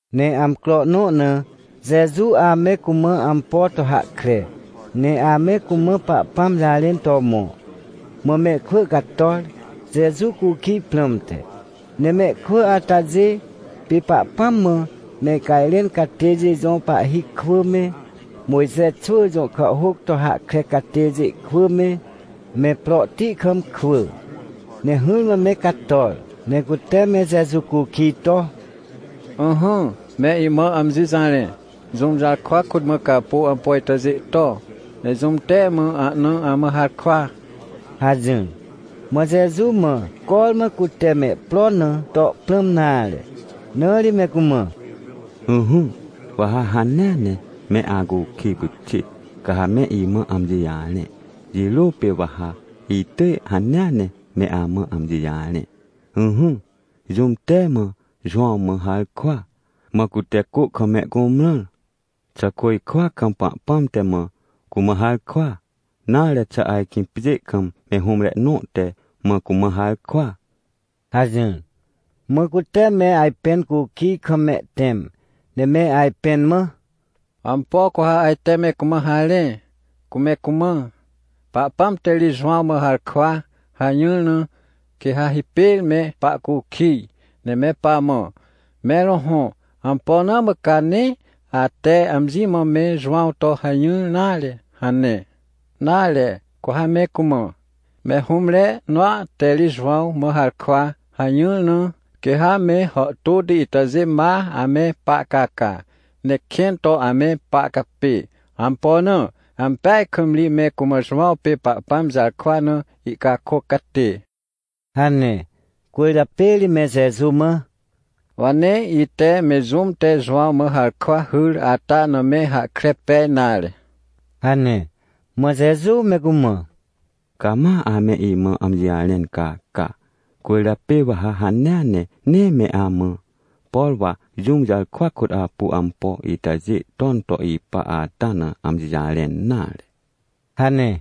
Ne amcro nõ na, Jeju ame cumã ampo to hahkre, ne ame cumã Pahpãm jarẽn to mõ. Mã mehkwỳ cator, Jeju cukij prãmte. Ne mehkwỳ atajê pê Pahpãm mã mehcajrẽn catêjê jõ pahhi kwỳ me, Mojxe xwỳ jõ kàhhôc to hahkre catêjê kwỳ me, me prohti kam kwỳ. Ne hỹrmã me cator, ne cute me Jeju cukij to: ― Ỹhỹ, me imã amji jarẽ, jũm jarkwa kôt mã ca apu ampo itajê to? Ne jũm te mã ahna amã harkwa? ― hajỹr. Mã Jeju mã cormã cute mehpro na to prãm nare, na ri me cumã: ― Ỹhỹ, wa ha hanea ne me acukij pyxit, ca ha me imã amji jarẽ, jirô pê wa ha itỳj hanea ne me amã amji jarẽ. Ỹhỹ, jũm te mã Jowãw mã harkwa, mã cute cô kam me cumrãr? Xà côjkwa kam Pahpãm te mã cumã harkwa? Nare xà ajkĩ pjê kam me hũmre nõ te mã cumã harkwa? ― hajỹr. Mã cute me ajpẽn cukij kam mehtẽm, ne me ajpẽn mã: ― Ampo cu ha ajte me cumã harẽ? Cu me cumã: “Pahpãm te ri Jowãw mã harkwa” hajỹr na, quê ha hipêr me pahcukij, ne me pamã: “Mẽr hõhõ, ampo na mã ca nee ate amji mã me Jowãw to hajỹr nare?” hane. Nare, cu ha me cumã: “Me hũmre nõa te ri Jowãw mã harkwa” hajỹr na, quê ha me hàhtôti itajê ma ame pahcaca, ne kẽn to ame pahcapê. Ampo na? Ampeaj kam ri me cumã Jowãw pê Pahpãm jarkwa na ihcakôc catê ― hane. Cwỳrjapê ri me Jeju mã: ― Wa nee ite me jũm te Jowãw mã harkwa hyr ata na me hahkre pej nare ― hane. Mã Jeju me cumã: ― Ca ma ame imã amji jarẽn caca, cwỳrjapê wa ha hanea ne nee me amã, por wa jũm jarkwa kôt apu ampo itajê ton to ipa ata na amji jarẽn nare ― hane.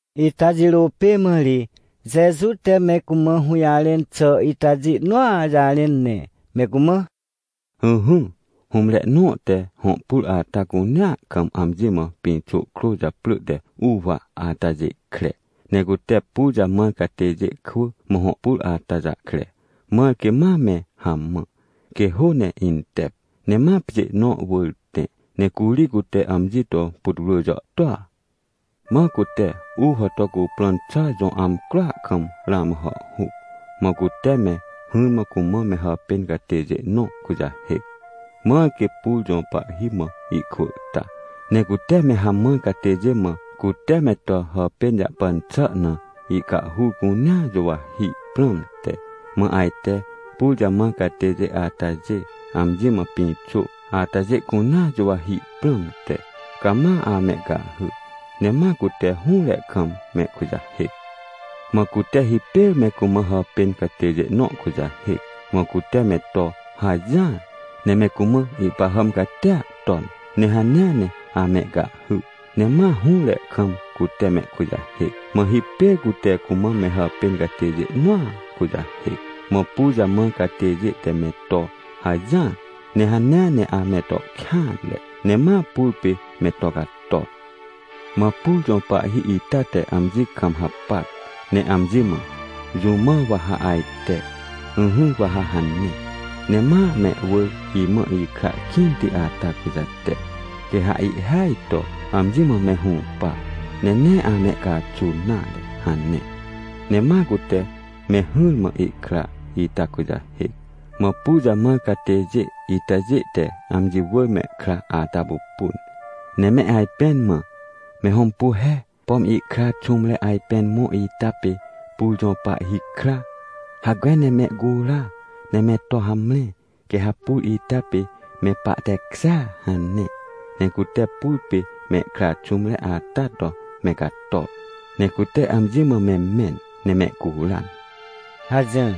Ita jirô pê mã ri Jeju te me cumã hũjarẽn xà itajê nõa jarẽn, ne me cumã: ― Ỹhỹ, hũmre nõ te hõ pur ata cunea kam amji mã pĩxô krô japrỳ te uwa atajê kre. Ne cute pur jamãr catêjê kwỳ mã hõ pur ata jahkre, mãr quê ma me hamã, quê hô ne intep. Ne ma pjê nõ wỳr tẽ, ne curi cute amji to putwrỳ jàhtôa. ― Mã cute uwa to cuprõn xà jõ amcroa kam ramã hàhhuc, mã cute me hỹrmã cumã me hàpên catêjê nõ kujahêc, mãr quê pur jõ pahhi mã ihkwỳ ta, ne cute me hamãr catêjê mã cute me to hàpên jahpan xà na ihcahhur cunea juwahi prãmte. Mã ajte pur jamãr catêjê atajê amji mã pĩxô atajê cunea juwahi prãmte, cama amehcahhy, ne ma cute hũre kam mehkujahêc. Mã cute hipêr me cumã hàpên catêjê nõ kujahêc, mã cute me to hajỹar ne me cumã ihpahàm catia ton, ne hanea ne amehcahhy, ne ma hũre kam cute mehkujahêc. Mã hipêr cute cumã me hàpên catêjê nõa kujahêc, mã pur jamãr catêjê te me to hajỹar, ne hanea ne ame to kêanre, ne ma pur pê me to cator. ― Mã pur jõ pahhi ita te amji kam hapac, ne amji mã: “Jũ mã wa ha ajte? Ỹhỹ, wa ha hane, ne ma mehwỳr imã ikra kĩnti ata kujate. Quê ha ihhêaj to amji mã me hũpa, ne nee amehcaxun nare” hane. Ne ma cute me hỹrmã ihkra ita kujahêc. ― Mã pur jamãr catêjê itajê te amji wỳr mehkra ata pupun, ne me ajpẽn mã: “Me hõmpu he, pom ihkra xũmre ajpên mõ ita pê pur jõ pahhi kra. Hacme ne mehcura, ne me to hamre, quê ha pur ita pê me pahtekjêa” hane. ― Ne cute pur pê mehkra xũmre ata to me cator, ne cute amji mã me mẽn, ne mehcuran ― hajỹr.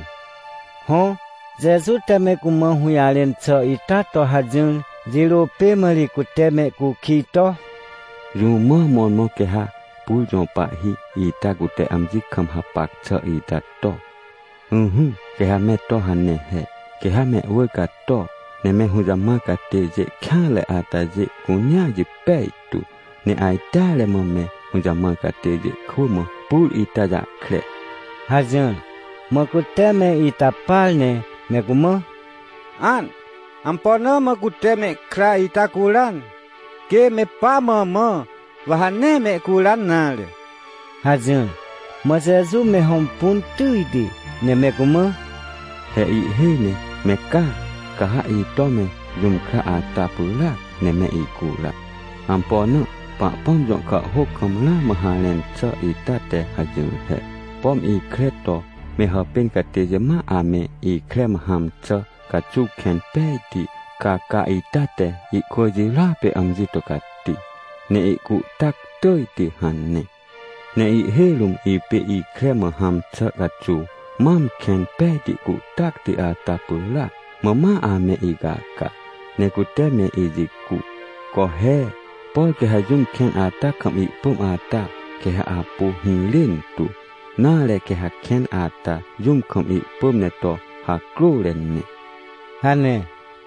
Hõ, Jeju te me cumã hũjarẽn xà ita to hajỹr jirô pê mã ri cute mehcukij to: ― Jũ mã mõrmõ quê ha pur jõ pahhi ita cute amji kam hapac xà ita to? Ỹhỹ, quê ha me to hane he. Quê ha mehwỳr cato ne me hũjamãr catêjê kêanre atajê cunea jipej tu, ne ajteare mã me hũjamãr catêjê kwỳ mã pur ita jahkre ― hajỹr. Mã cute me ita par ne me cumã: ― An! Ampo na mã cute mehkra ita curan? Quê me pa mã mã, wa ha nee mehcuran nare! ― hajỹr. Mã Jeju me hõmpun tỳjti, ne me cumã: ― He ihhêj ne me caa, ca ha ito me jũm kra ata pyràc ne me icura. Ampo na? Pahpãm jõ kàhhôc kam ramã harẽn xà ita te hajỹr he: “Pom ikre to me hàpên catêjê ma ame ikre mã hãm xà caxuw kẽn pejti caca ita te ihkwỳ jirôa pê amji to cati, ne ihcuhtac tỳjti” hane. Ne ihhêj rũm ipê ikre mã hãm xà caxuw mam kẽn pejti cuhtacti ata pyràac, mã ma ame icaca, ne cute me ijicu. Co he, por quê ha jũm kẽn ata kam ihpỳm ata, quê ha apu hirên tu. Nare, quê ha kẽn ata jũm kam ihpỳm ne to hacrôre ne ― hane.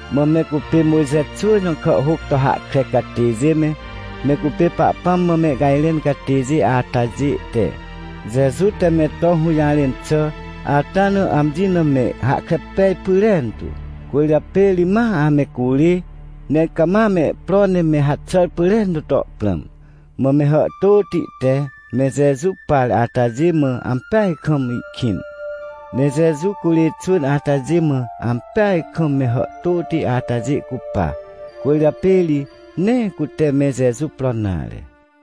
Mã me cupê Mojxe xwỳ jõ kàhhôc to hahkre catêjê me, me cupê Pahpãm mã mehcajrẽn catêjê atajê te, Jeju te me to hũjarẽn xà ata na amji na me hahkre pej pyrentu, cwỳrjapê ri ma ame curê, ne cama mehpro ne me haxàr pyrentu to prãm. Mã me hàhtôti te me Jeju par atajê mã ampeaj kam ihkĩn. Ne Jeju curê xwỳn atajê mã ampeaj kam me hàhtôti atajê cupa, cwỳrjapê ri nee cute me Jeju pro nare.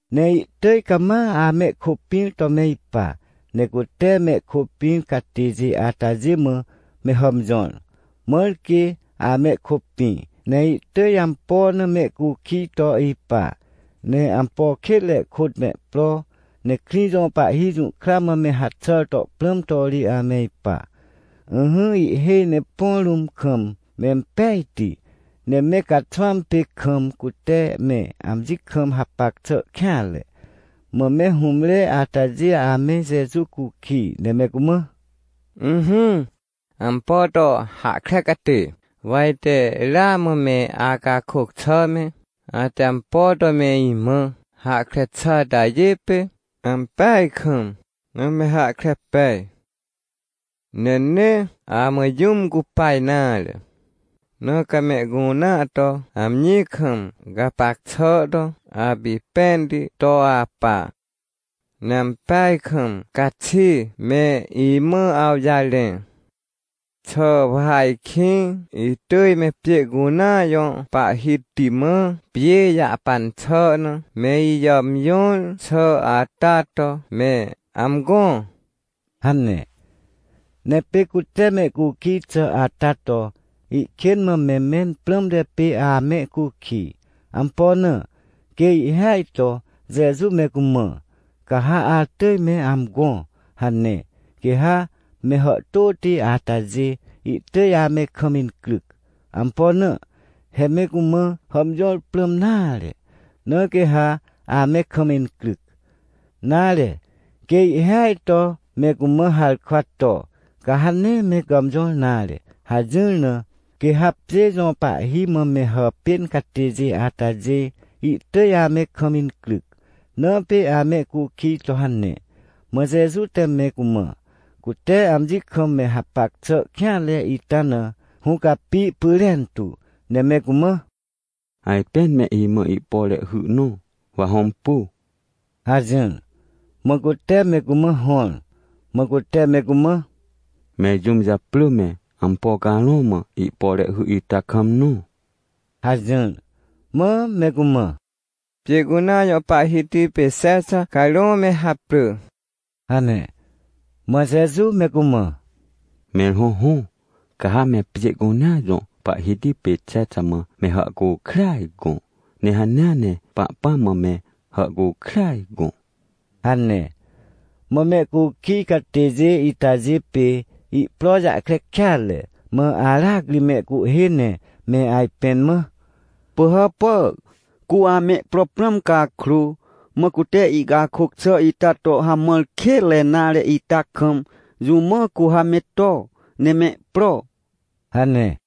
Ne ihtỳj cama amehkôpĩr to me ipa. Ne cute mehkôpĩr catêjê atajê mã me hàmjõr, mãr quê amehkôpĩ, ne ihtỳj ampo na mehcukij to ipa, ne ampo kênre kôt mehpro, ne krĩ jõ pahhi jũhkra mã me haxàr to prãm to ri ame ipa. Ỹhỹ, ihhêj ne põ rũm kam mempejti, ne me caxwãm pê, kam cute me amji kam hapac xà kêanre. Mã me hũmre atajê ame Jeju cukij, ne me cumã: ― Ỹhỹ, ampo to hahkre catê, wa ite ramã me acakôc xà me, ate ampo to me imã hahkre xà atajê pê ampeaj kam na me hahkre pej. Ne nee amã jũm cupa nare, na ca mehcunea to amji kam gapac xà to apipẽnti to apa. Ne ampeaj kam caxi me imã awjarẽ. Xà wa ajkĩ itỳj me pjê cunea jõ pahhiti mã pjê jahpan xà na me ijàmjõr xà ata to me amgõ? ― hane. Ne pê cute mehcukij xà ata to, ihkên mã me mẽn prãmte pê amehcukij. Ampo na? Quê ihhêaj to Jeju me cumã: “Ca ha atỳj me amgõ” hane, quê ha me hàhtôti atajê ihtỳj ame kam incryc. Ampo na? He me cumã hàmjõr prãm nare, na quê ha ame kam incryc. Nare, quê ihhêaj to me cumã harkwa to: “Ca ha nee me gàmjõr nare” hajỹr na, quê ha pjê jõ pahhi mã me hàpên catêjê atajê ihtỳj ame kam incryc, na pê amehcukij to hane. Mã Jeju te me cumã, cute amji kam me hapac xà kêanre ita na hũcapi pyrentu, ne me cumã: ― Ajpên me imã ihpore hy nõ, wa hõmpu ― hajỹr. Mã cute me cumã hõr. Mã cute me cumã: ― Mẽr jũm japrỳ me, ampo carõ mã ihpore hy ita kam nõ? ― hajỹr. Mã me cumã: ― Pjê cunea jõ pahhiti pê Xexa carõ me haprỳ ― hane. Mã Jeju me cumã: ― Mẽr hõhõ, ca ha me pjê cunea jõ pahhiti pê Xexa mã me hàhcukrêaj gõ, ne hanea ne Pahpãm mã me hàhcukrêaj gõ ― hane. Mã mehcukij catêjê itajê pê ihpro jahkre kêatre mã aracri mehcuhhê ne me ajpẽn mã: ― Pỳhàpà, cu amehpro prãm cakrô, mã cute ihcakôc xà ita to hamãr kênre nare ita kam, jũ mã cu ha me to, ne mehpro? ― hane.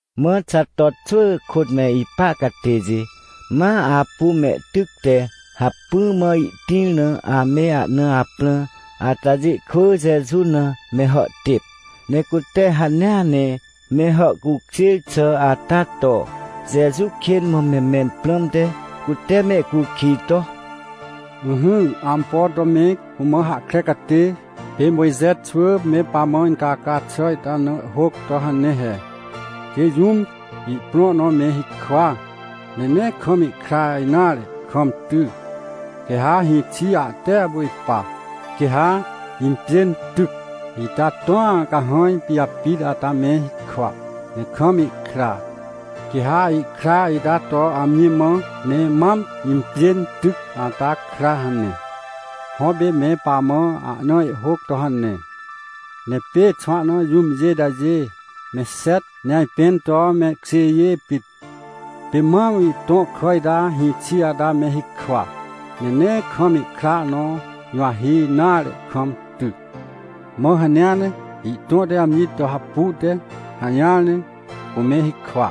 Mã Xato xwỳ kôt me ipa catêjê ma apu mehtyc te hacpỹ mã ihtĩr na ame ahna aprã atajê kwỳ Jeju na me hàhtêp. Ne cute hanea ne me hàhcukjêr xà ata to, Jeju kên mã me mẽn prãmte, cute mehcukij to: ― Ỹhỹ, ampo to me cumã hahkre catê, pê Mojxe xwỳ me pamã incaca xà ita na ihhôc to hane he: “Quê jũm ihprõ nõ me hikwa, ne nee kam ihkra nare kam ty, quê ha hĩxi ahte apu ipa. Quê ha impjên tyc ita tõa cahãj pijapit ata me hikwa, ne kam ihkra. Quê ha ihkra ita to amji mã me mam impjên tyc ata kra” hane. Hõ, pê me pamã ahna ihhôc to hane. Ne pê xwahna jũmjê itajê me xet ne ajpẽn to mehkjêjê pit. Pê mam ihtõ kà ita hĩxi ata me hikwa, ne nee kam ihkra nõ juwahi nare kam ty. Mã hanea ne ihtõ te amji to hapu te hajỹar ne cume hikwa,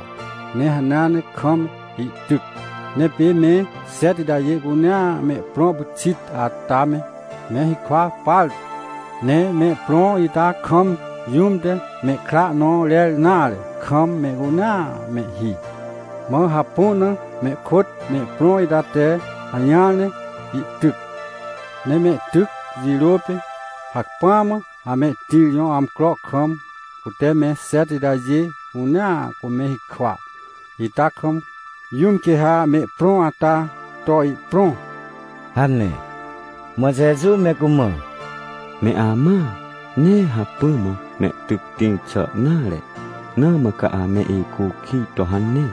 ne hanea ne kaam ihtyc. Ne pê me xet itajê cunea mehprõ pyxit ata me, me hikwa partu, ne mehprõ ita kam jũm te mehkra nõ rer nare kam mehcunea mehhi. Mã hapu na mehkôt mehprõ ita te hajỹar ne ihtyc. Ne mehtyc jirô pê, hacpỹa mã amehtĩr jõ amcro kam, cute me xet itajê cunea cume hikwa ita kam, jũm quê ha mehprõ ata to ihprõ? ― hane. Mã Jeju me cumã: ― Me amãa, nee hacpỹ mã mehtyc tĩr xà nare, na mã ca ame icukij to hane.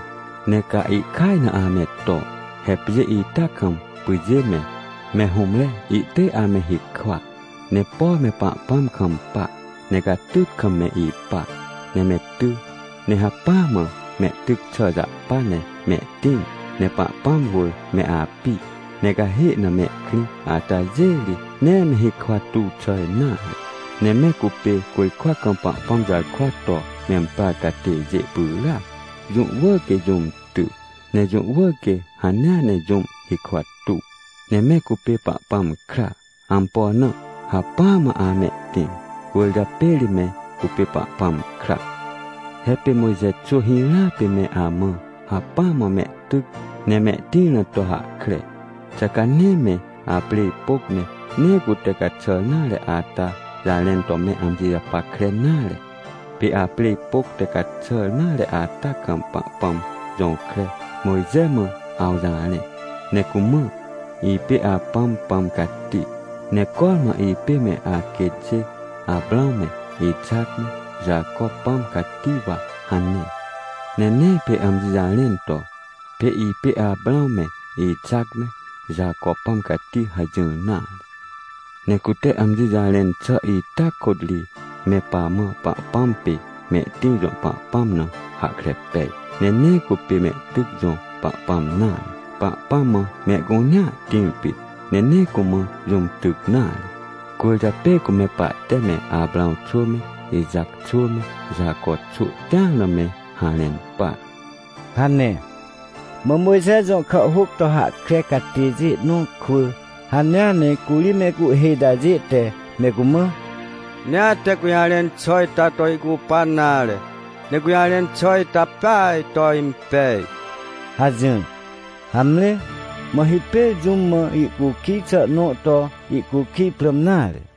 Ne ca ihkaj na ame to. He pjê ita kam pyjê me, me hũmre ihtỳj ame hikwa. Ne por me Pahpãm kampa, ne catyt kam me ipa, ne me ty, ne hacpỹa mã mehtyc xà jahpa ne mehtĩr, ne Pahpãm wỳr me api, ne cahê na mehkrĩ atajê ri, nee me hikwa tuw xà nare. Ne me cupê côjkwa kam Pahpãm jarkwa to memprar catêjê pyràac. Jũ wỳr quê jũm ty, ne jũ wỳr quê hanea ne jũm hikwa tuw. Ne me cupê Pahpãm kra. Ampo na? Hacpỹa mã amehtĩr, cwỳrjapê ri me cupê Pahpãm kra. ― He pê Mojxe xwỳ hirãa pê me amã hacpỹa mã mehtyc ne mehtĩr na to hahkre. Xà ca nee me aprêj pôc ne nee cute caxàr nare ata jarẽn to me amji japackre nare? Pê aprêj pôc te caxàr nare ata kam Pahpãm jõkre Mojxe mãaw jarẽ, ne cumã: “Ipê apãm Pãm Cati, ne cormã ipê me aquêtjê Aprãw me, Ixac me, Jaco Pãm Cati wa” hane. Ne nee pê amji jarẽn to: “Pê ipê Aprãw me, Ixac me, Jaco Pãm Cati” hajỹr nare. Ne cute amji jarẽn xà ita kôt ri me pamã Pahpãm pê mehtĩr jõ Pahpãm na hahkre pej, ne nee cupê mehtyc jõ Pahpãm nare. Pahpãm mã mehcunea tĩr pit, ne nee cumã jũm tyc nare. Cwỳrjapê cu me pahte me Aprãw xwỳ me, Ixac xwỳ me Jaco xwỳ tĩar na me harẽn par ― hane. Mã Mojxe jõ kàhhôc to hahkre catêjê nõ kwỳ hanea ne curi mehcuhhê itajê te me cumã: ― Nee ate gũjarẽn xà ita to ihcupan nare. Ne gũjarẽn xà ita peaj to impej ― hajỹr. Hamre, mã hipêr jũm mã ihcukij xà nõ to ihcukij prãm nare.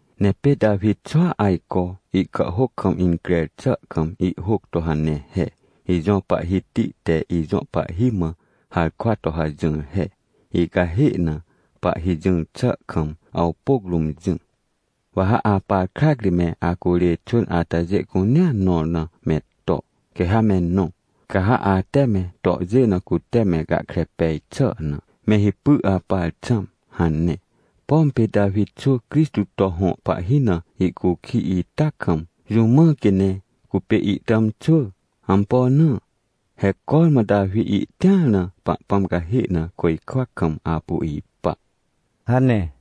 Ne pê Tawi xwỳa ajco ihkàhhôc kam increr xà kam ihhôc to hane he: “Ijõ Pahhiti te ijõ pahhi mã harkwa to hajỹr he: ‘Icahê na, Pahhi jỹr xà kam, awpôc rũm jỹ. Wa ha apar krac ri me acurê xwỳn atajê cunea nõr na me to, quê ha me nõ, ca ha ate me tohjê na cute me gahkre pej xà na, me hipy apar xãm’” hane. Pom pê Tawi xwỳ Crixtô to hõ pahhi na ihcukij ita kam, jũ mã quê ne cupê ihtàmxwỳ? Ampo na? He cormã Tawi ihtĩar na Pahpãm cahê na côjkwa kam apu ipa ― hane.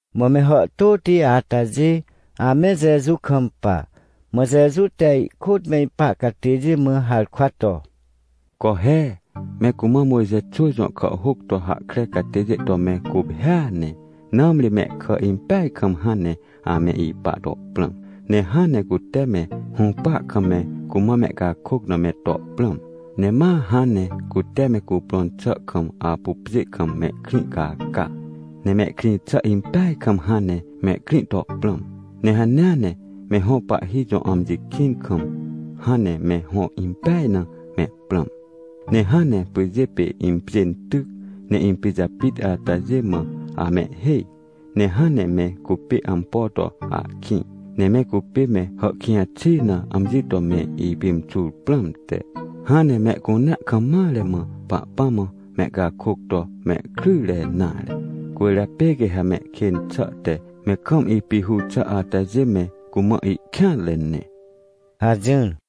Mã me hàhtôti atajê ame Jeju kampa, mã Jeju te ihkôt me ipa catêjê mã harkwa to: ― Co he, me cumã Mojxe xwỳ jõ kàhhôc to hahkre catêjê to me guphêa ne, nãmri mehkà impeaj kam hãn ne ame ipa to prãm, ne hãn ne cute me hũpa kam me cumã mehcakôc na me to prãm. Ne ma hãn ne cute me cuprõn xà kam apu pjê kam mehkrĩ caca, ne mehkrĩ xà impeaj kam hãn ne mehkrĩ to prãm. Ne hanea ne me hõ pahhi jõ amji kĩn kam, hãn ne me hõ impeaj na mehprãm. Ne hãn ne pyjê pê impjên tyc ne impijapit atajê mã amehhêj, ne hãn ne me cupê ampo to ahkĩ. Ne me cupê me hàhkĩj xi na amji to me ipimxur prãmte, hãn ne mehcunea kam mare mã Pahpãm mã mehcakôc to mehkrỹnre nare. Cwỳrjapê quê ha mehkên xà te me kam ipihur xà atajê me cumã ihkêanre ne ― hajỹr.